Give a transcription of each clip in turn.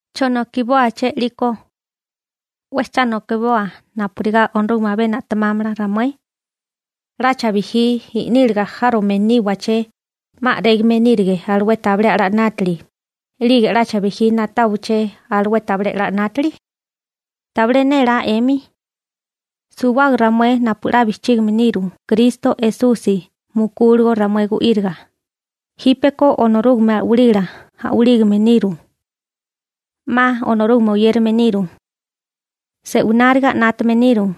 ¿Chonokibóaché 'liko? ¿'We cha nokiboa napurigá Onorúgame abé na'temámala ramué? ¿'Lacha bijí i'níliga járome níwaché, 'ma a'régame nírige alué tabilé a'lá 'nátili, 'lige 'lacha bijí na'táwaché alué tabilé a'lá 'nátili? ¿Tabilé nélá 'emi? Suwábaga ramué napu 'la bijchígime niru Kristo Esusi mukúligo ramué gu'íriga, jípeko Onorúgame a'walila a'walígame niru. 'Ma Onorúgame oyérame niru. Se'wináriga 'nátame niru.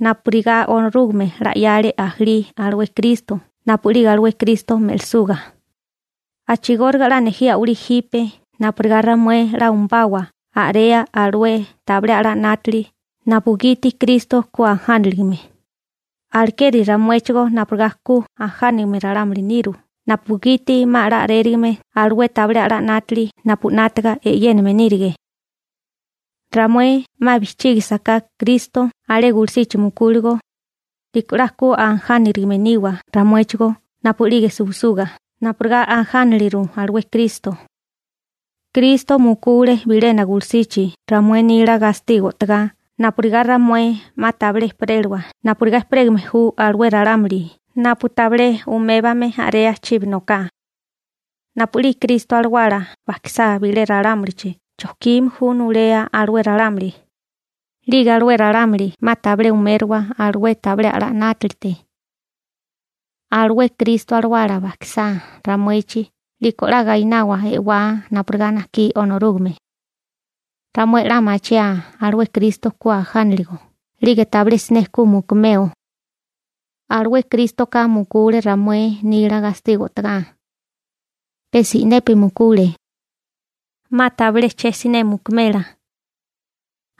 Napurigá Onorúgame 'la 'yale ajalí alué Kristo napu'lige alué Kristo me'lisuga, a'chigóriga 'la nejí a'walí jipe napurigá ramué 'la umabawa a'rea alué tabilé a'lá 'nátili napugiti Kristo ku ajániligame, alekeri ramuéchigó napurigá ku ajánigame ralámuli niru napugiti 'ma 'la a'rérigame alué tabilé a'lá 'nátili napu 'nátaga e'yéname nírige. Ramué 'ma bijchígisiká Kristo alé gulusichi mukúligo, 'liko 'la ku ajánarigame niwa ramuéchigó napu'lige suwisuga napurigá ajánaliru alué Kristo. Kristo mukule bilena gulusichi ramué nila gastigo o'togá napurigá ramué 'ma tabilé ejperélawa napurigá ejperégame ju alué ralámuli napu tabilé umébame a'rea chibi noká. Napu'lige Kristo alawala bajkisá bilé ralámulichi chojkime ju nulea alué ralámuli, 'lige alué ralámuli 'ma tabilé umériwa alué tabilé a'lá 'nátalite. Alué Kristo alawala bajkisá ramuechi 'liko 'la gainawa e'wá napurigá najkí Onorúgame. Ramué 'la machiaa alué Kristo ku ajánaligo 'lige tabilé siné ku mukumeo. Alué Krístoka mukule ramué nila gastigo o'togá. Pe si'nepi mukule. 'Ma tabilé che siné mukumela.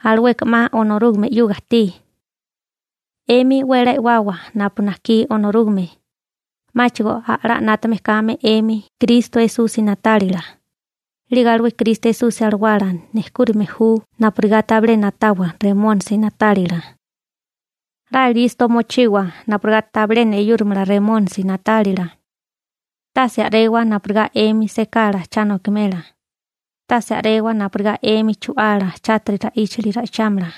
Alueka 'ma Onorúgame 'yuga ajtí. 'Emi 'we 'la e'wawa napu najkí Onorúgame, 'máchigo a'lá 'nátame kame 'emi Kristo Esusi na'tálila, 'lige alué Kristo Esusi alawala nejkúrime ju napurigá tabilé na'tawa Remónisi na'tálila. 'La listo mochiwa napurigá tabilé neyúrimala Remónisi na'tálila. Tase a'rewa napurigá 'emi sekala cha nokimela, tase a'rewa napurigá 'emi chu'ala chátiri ra'íchali ra'ichámala.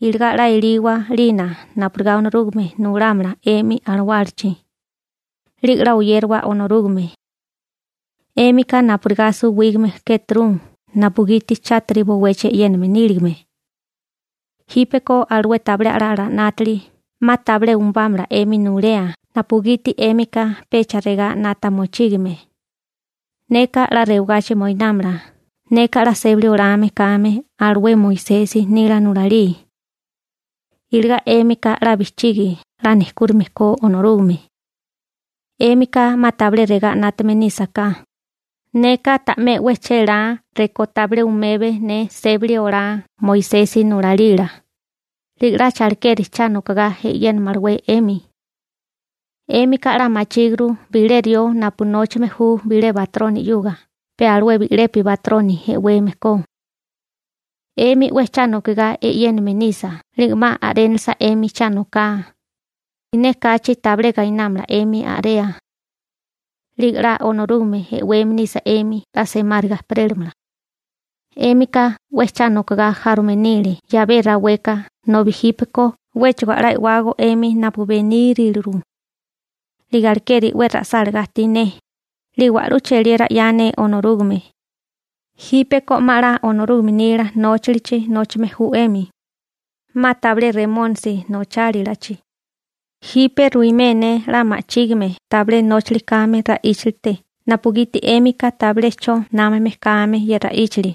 Iligá 'la eliwa 'lina napurigá Onorúgame nulámala 'emi alawálachi, 'lige 'la oyérawa Onorúgame. 'Émika napurigá suwígame kéturu napugiti chátiri bowechi e'yéname níligame. Jípeko alué tabilé a'lá 'nátili 'ma tabilé umubámala 'emi nulea napugiti 'émika pecha regá 'nata mochígime: «Neka 'la rewagachi moinámala neka 'la sébali olame kame alué Moisesi nila nulalí.» Iligá 'émika 'la bijchigi 'la nejkúrime ko Onorúgame. 'Émika 'ma tabilé regá 'nátame nísaká: «Neka ta'mé 'we chélá rekó tabilé umebe ne sébali olá Moisesi nulalila», 'lige 'lacha alekeri cha nokogá e'yénamalawé 'emi. 'Émika 'la machíguru bilé rió napu nóchame ju bilé batroni 'yuga pe alué bi'lepi batroni e'weme ko. 'Emi 'we cha nokigá e'yéname nisa 'lige 'ma a'rénalasa 'emi cha noká, siné kachi tabilé gainámala 'emi a'rea. 'Lige 'la Onorúgame e'weme nisa 'emi 'la semáriga ejperélamala. 'Émika 'we cha nokogá járome nile 'yabé raweka nobi jípeko 'wéchigo a'lá e'wágó 'emi napu beníriliru. 'Lige alekeri 'we ra'sálagá ajtí ne, 'lige wa'lú cheliera 'ya ne Onorúgame. Jípeko 'ma 'la Onorúgame nila nóchalichi nóchame ju 'emi. 'Ma tabilé Remónisi nochálilachi. Jipe ruimé ne 'la ma'chígime tabilé nóchali kame ra'íchalite napugiti 'émika tabilé 'cho námame kame ye ra'íchali.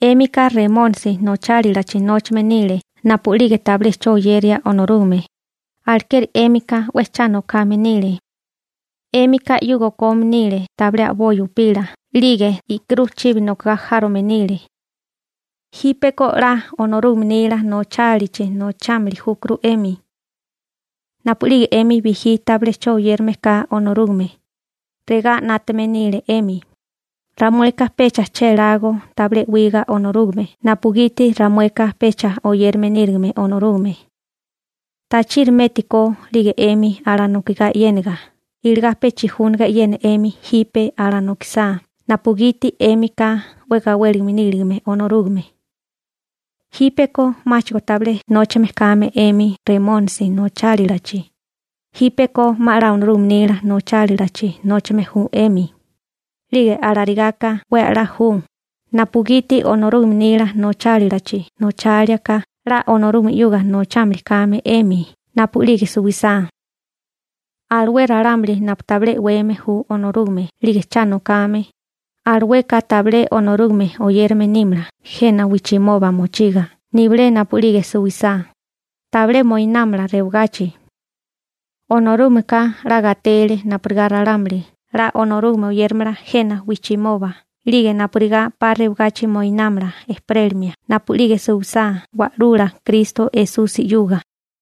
'Émika Remónisi nochálilachi nóchame nile napu'lige tabilé 'cho oyeria Onorúgame, alekeri 'émika 'we cha nokame nile. 'Émika 'yuga okome nile tabilé a'boi upila 'lige i'kirú chibi nokagá járome nile. Jípeko 'la Onorúgame nila nochálilachi nochámili júkuru 'emi. Napu'lige 'emi bijí tabilé 'cho oyérame ka Onorúgame, regá 'nátame nile 'emi: «Ramueka pecha chélágó tabilé e'wiga Onorúgame napugiti ramueka pecha oyérame nírigime Onorúgame.» ¿Tachiri métukó 'lige 'emi alanokigá e'yénaga iligá pe chijúnaga e'yena 'emi jipe alanokisá napugiti 'émika 'we gawélime níligame Onorúgame? Jípeko 'máchigo tabilé nóchame kame 'emi Remónisi nochálilachi, jípeko 'ma 'la Onorúgame nila nochálilachi nóchame ju 'emi, 'lige alarigáká 'we 'la ju, napugiti Onorúgame nila nochálilachi nocháliaká 'la Onorúgame 'yuga mochímili kame 'emi napu'lige suwisá. Alué ralámuli napu tabilé e'weme ju Onorúgame 'lige cha nokame, alueka tabilé Onorúgame oyérame nímala jena wijchimoba mochiga nibilé napu'lige suwisá, tabilé moinámala rewagachi. Onorúgameka 'la gatele napurigá ralámuli 'la Onorúgame oyéramala jena wijchimoba 'lige napurigá 'pa rewagachi moinámala ejperélimia napu'lige suwisá Wa'lula Kristo Esusi 'yuga.